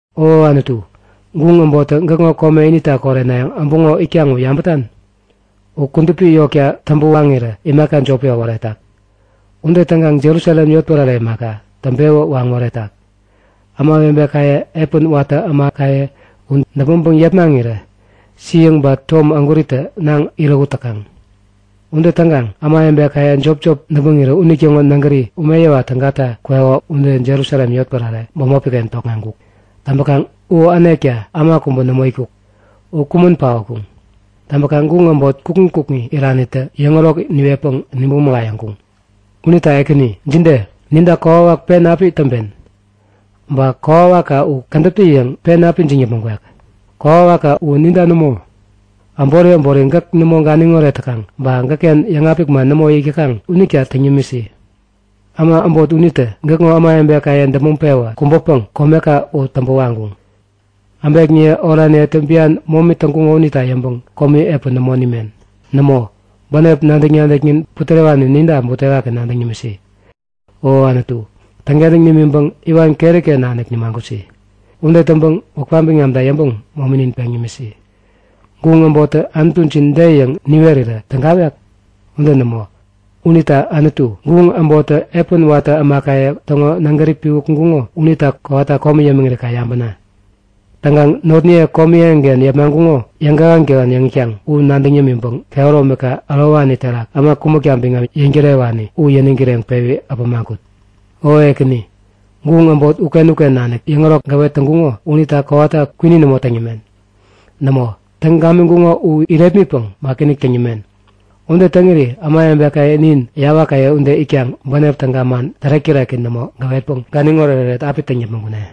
O Anutu, guŋ äbottä gäkŋo kome inita korenayäŋ äbuŋo itkaŋ, u yabätan? U kudupi yotka täŋpä waŋirä imaka jopi äworetak. Ude täŋkaŋ Jerusalem yotpärare imaka, täŋpewä waŋ moretak. Ämawebekaye, epän watä ämakaye u däpmäŋpäŋ yepmaŋirä siäŋ ba tom ägwäritä naŋ-irähut täkaŋ. Ude täŋkaŋ ämawebekaye jopjop däpmäŋirä unitäŋo nägäri umeyäwa tägata kweko ude Jerusalem yotpärare bämopiken tokŋeŋkuk. Täŋpäkaŋ u änekta äma kubä nämo itkuk. U kumän paotkuŋ. Täŋpäkaŋ guŋ äbot kukŋi kukŋi iranitä yäŋärok niwetpäŋ nibäŋ mägayäkuŋ. Unita Ekäni, jide? Ninta kokwawak pen api täŋpen? Ba kokwawakka u kädäptä-yäŋ pen api ijiŋ yäpmäŋ kwek? Kokwawakka u ninta nämo, äbori äbori gäk nämo ganiŋoret täkaŋ ba gäkken yäŋapik man nämo yäk täkaŋ unita täŋ yämisi. Äma äbot unitä gäkŋo ämawebekaye däpmäŋ-pewä kubäpäŋ komeka u täŋpä waŋkuŋ. Äbekniye oraniyetä bian momi täŋkuŋo unita yäŋpäŋ komi epän nämo nimen. Nämo, bänep nadäk-nadäknin putärewani ninta butewaki nadäŋ nimisi. O Anutu, täŋkentäŋ nimiŋpäŋ iwan keriken nanik nimagusi. Ude täŋpäŋ wäpka biŋamta yäŋpäŋ mominin peŋ nimisi. Guŋ äbottä Anutujin de yäŋ niwerirä tägawek? Ude nämo, unita Anutu, guŋ äbottä epän watä ämakaye täŋo nägäri piwä kuŋkuŋo unita kowata komi yämiŋiri kaŋ yabäna! Täŋkaŋ notniye komi eŋiken yepmaŋkuŋo yäŋkähän-kähän yäŋ itkaŋ u nadäŋ yämiŋpäŋ kehäromika ärowani terak äma kumäkta biŋam yäŋtärewani u yäniŋ kireŋpewi äpämaŋ kut. O Ekäni, guŋ äbot uken-uken nanik yäŋärok gäwet täŋkuŋo unita kowata kwini nämo täŋ yämen. Nämo, täŋ gamiŋkuŋo u irepmitpäŋ wakiinik täŋ yämen. Ude täŋiri ämawebekaye nin, yawakaye ude itkaŋ bänep täga man tärek-täreki nämo gäwetpäŋ ganiŋ oretoret api täŋ yäpmäŋ kune.